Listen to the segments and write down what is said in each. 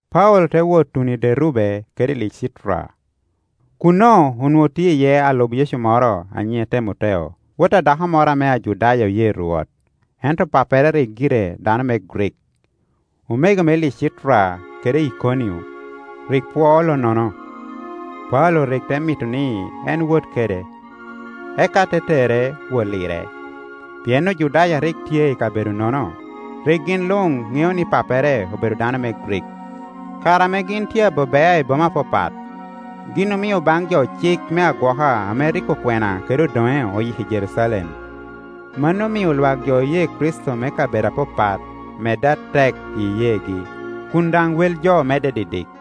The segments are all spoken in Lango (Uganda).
Paulo te wot tuno i Derube kede i Licitra. Kuno onwoŋo tye iye alub Yecu moro a nyiŋe Temoteo, wot a dako moro ame Ajudaya oye Rwot, ento pappere rik gire dano me Grik. Omego me Licitra kede Ikonio rik pwoo lonnono. Paulo rik te mito ni en wot kede; eka te tere wot lire, pien Ojudaya a rik tye i kabedo-nono, rik gin luŋ ŋeo ni pappere obedo dano me Grik. Kare ame gin tye abe bea i boma apapat, gin omio baŋ jo cik me agwoka ame rik okwena kede odoŋe oyiko i Jerucalem. Mano omio lwak jo oye Kricito me kabedo apapat medde atek i iyeegi, kun daŋ wel jo medde didik.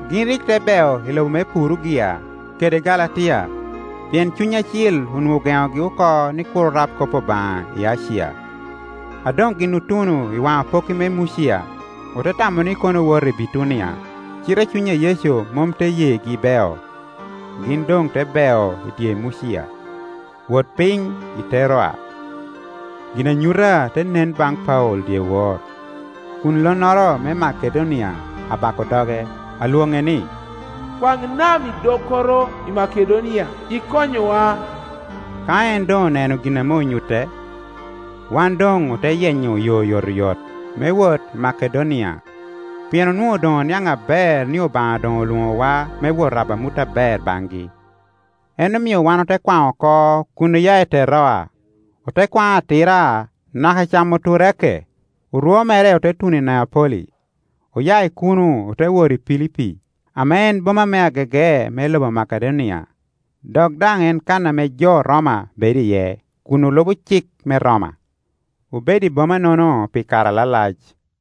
Gin rik te bel i lobo me Purugia kede Galatia, pien Cuny Acil onwoŋo ogenogi oko ni kur orab kop Obaŋa i Acia. A doŋ gin otuno i waŋ apokki me Mucia, ote tamo ni kono owoto i Bitunia, cite Cuny a Yecu mom te yegi beo. Gin doŋ te beo i dye Mucia, wot piny i Teroa. Ginanyuta te nen baŋ Paulo dyewor, kun lonnoro me Makedonia abako doge, alwoŋe ni, “Kwaŋ nam idokoro i Makedonia, ikonywa.” Ka en doŋ oneno gin ame onyutte, wan doŋ ote yenyo yo oyotoyot me wot i Makedonia, pien onwoŋo doŋ oniaŋ aber ni Obaŋa doŋ olwoŋowa me wot rabo amut aber baŋgi. En omio wan ote kwaŋ oko kun oya i Teroa, ote kwaŋ atira naka i Camoturake, orwo mere ote tuno Neapoli. Oya i kuno ote wot i Pilipi, ame en boma me agege me lobo Makedonia, dok daŋ en kan ame jo Roma bedo iye kun olubo cik me Roma. Obedo i boma-nono pi kare alalac.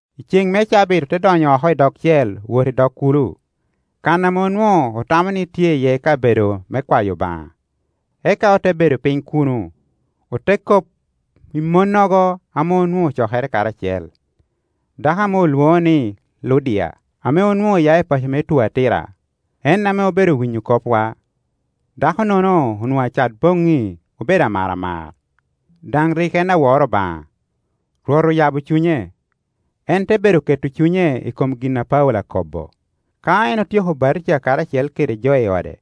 I cen me cabit ote donyo oko i dogcel wot i dog kulo, kan ame onwoŋo otamo ni tye iye kabedo me kwayo Obaŋa. Eka ote bedo piny kuno, ote kop i monnogo ame onwoŋo ocokere karacel. Dako ame olwoŋo ni Ludia, ame onwoŋo oya i paco me Tuatira, en ame obedo winyo kopwa. Dako-nono onwoŋo acat boŋŋi obedo amaramar, daŋ rik en awor Obaŋa. Rwot oyabo cunye, en te bedo keto cunye i kom gin a Paulo akobo. Ka en otyeko batija karacel kede jo i ode,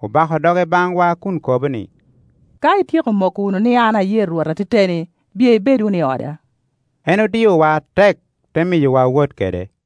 obako doge baŋwa kun kobo ni, “Ka ityeko moko wunu ni an aye Rwot ateteni, biye ibed wunu i oda,” En odiowa atek, te miyowa wot kede.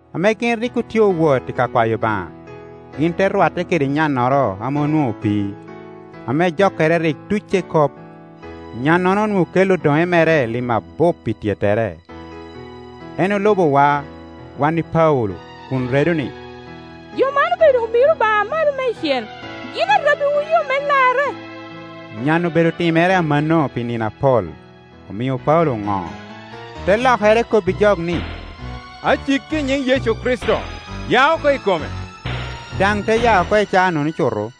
Ame gin rik otye owot i ka kwayo Obaŋa, gin te rwatte kede nyannoro ame onwoŋo opii, ame jokkere rik tucce kop. Nyannono onwoŋo kelli odoŋe mere lim abup pi tyettere. En olubowa wan i Paulo kun redo ni, “Jo man obedo omiro Obaŋa Amalo Meicel. Gin arabbiwu yo me larre.” Nyan-nu obedo timere amanno pi nino apol, omio Paulo oŋo, te lokere kobbijok ni, “Aciki i nyiŋ Yecu Kricito, ya oko i kome.” Daŋ te ya oko i caanono cuto.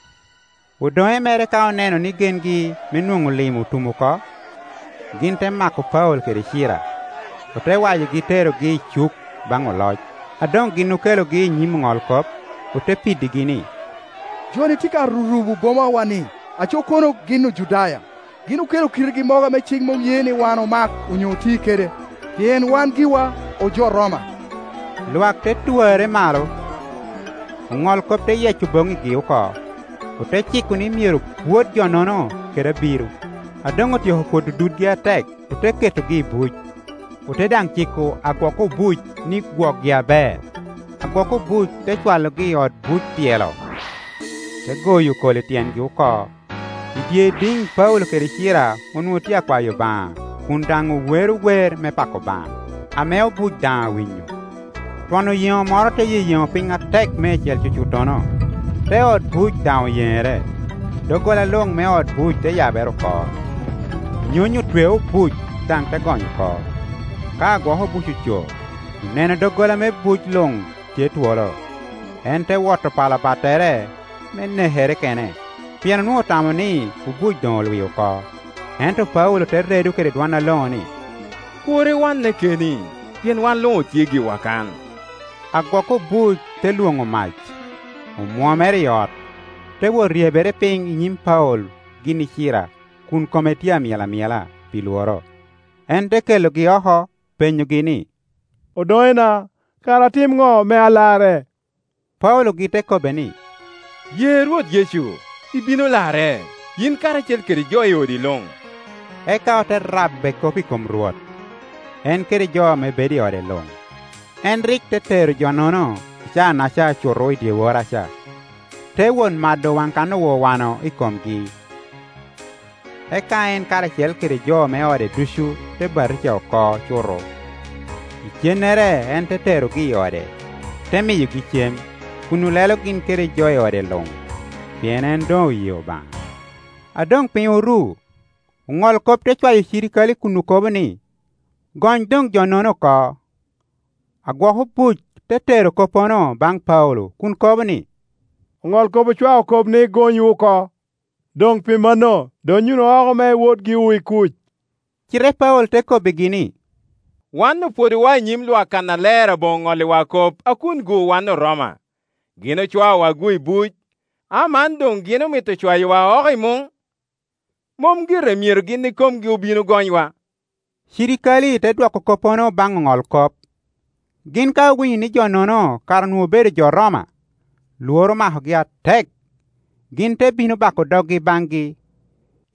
Odoŋe mere ka oneno ni gengi me nwoŋo Iim otum oko, gin te mako Paulo kede Cira, ote wayogi terogi i cuk baŋ oloc. A doŋ gin okelogi i nyim oŋolkop, ote piddigi ni, “Jo-ni tye ka rurubo boma wa-ni; aco kono gin Ojudaya. Gin okelo kitgi mogo ame cik mom ye ni wan omak onyo oti kede, pien wan giwa ojo Roma.” Lwak te twarre malo, oŋolkop te yeyeco boŋŋigi oko, ote ciko ni myero pwod jo-nono kede abiro. A doŋ otyeko pwodo dudgi atek, ote ketogi i buc, ote daŋ ciko agwok obuc ni gwokgi aber. Agwok obuc te cwalogi i ot buc tyelo, te goyo kol i tyengi oko. I dye idiŋ Paulo kede Cira onwoŋo tye akwayo Obaŋa kun daŋ owero wer me pako Obaŋa, ame obuc daŋ awinyo. Twon oyeŋo moro te yeyeŋo piny atek meicel cucuttono, te ot buc daŋ oyenere; doggola luŋ me ot buc te yabere oko, nyony otweo obuc daŋ te gony oko. Ka agwok obuc oco, oneno doggola me buc luŋ tye twolo; en te woto pala battere me nekere kene, pien onwoŋo otamo ni obuc doŋ olwi oko. Ento Paulo te redo kede dwon aloŋo ni, “Kur iwanne keni, pien wan luŋ otye giwa kan.” Agwok obuc te lwoŋo mac, omwomere i ot, te wot ryebere piny i nyim Paulo gin i Cira kun kome tye amyel amyela pi lworo. En te kelogi oko, penyogi ni, “Odoŋena, kara atim ŋo me alarre?” Paulogi te kobbe ni, “Ye Rwot Yecu, ibino larre, yin karacel kede jo i odi luŋ.” Eka ote rabbe kop i kom Rwot, en kede jo ame bedo i ode luŋ. En rik te tero jo-nono i caa-naca cuto i dyeworraca, te wot mado waŋ kan owawano i komgi. Eka en karacel kede jo me ode ducu ote batija oko cuto. Icennere en te terogi i ode, te miyogi cem, kun olelo gin kede jo i ode luŋ, pien en doŋoye Obaŋa. A doŋ piny oru, oŋolkop te cwayo cirikale kun okobo ni, “Gony doŋjo-nono oko.” Agwok obuc te tero koppono baŋ Paulo kun kobo ni, “Oŋolkop ocwao kop ni gonywu oko. Doŋ pi manno, donnyo wunu oko me iwot giwu i kuc.” Cite Paulo te kobbigi ni, “Wan opwodowa i nyim lwak kannaler aboŋo ŋolliwa kop a kungu wan Oroma! Gin ocwaowa-gu i buc. Aman doŋgin omito cwayowa oko i muŋ? Mom gire Myero gin ikomgi obin ogonywa.” Cirikale te dwoko koppono baŋ oŋolkop. Gin ka owinyo ni jo-nono kara onwoŋo obedo jo Roma, lworo omakogi atek. Gin te bino bako doggi baŋgi;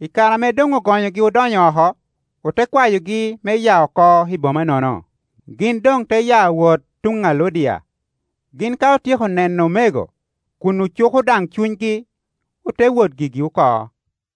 i kare ame doŋogonyogi odonyo oko, ote kwayogi me ya oko i bomanono. Gin doŋ te ya wot tuŋ a Ludia; gin ka otyeko neno omego, kun ocuko daŋ cunygi, ote wot gigi oko.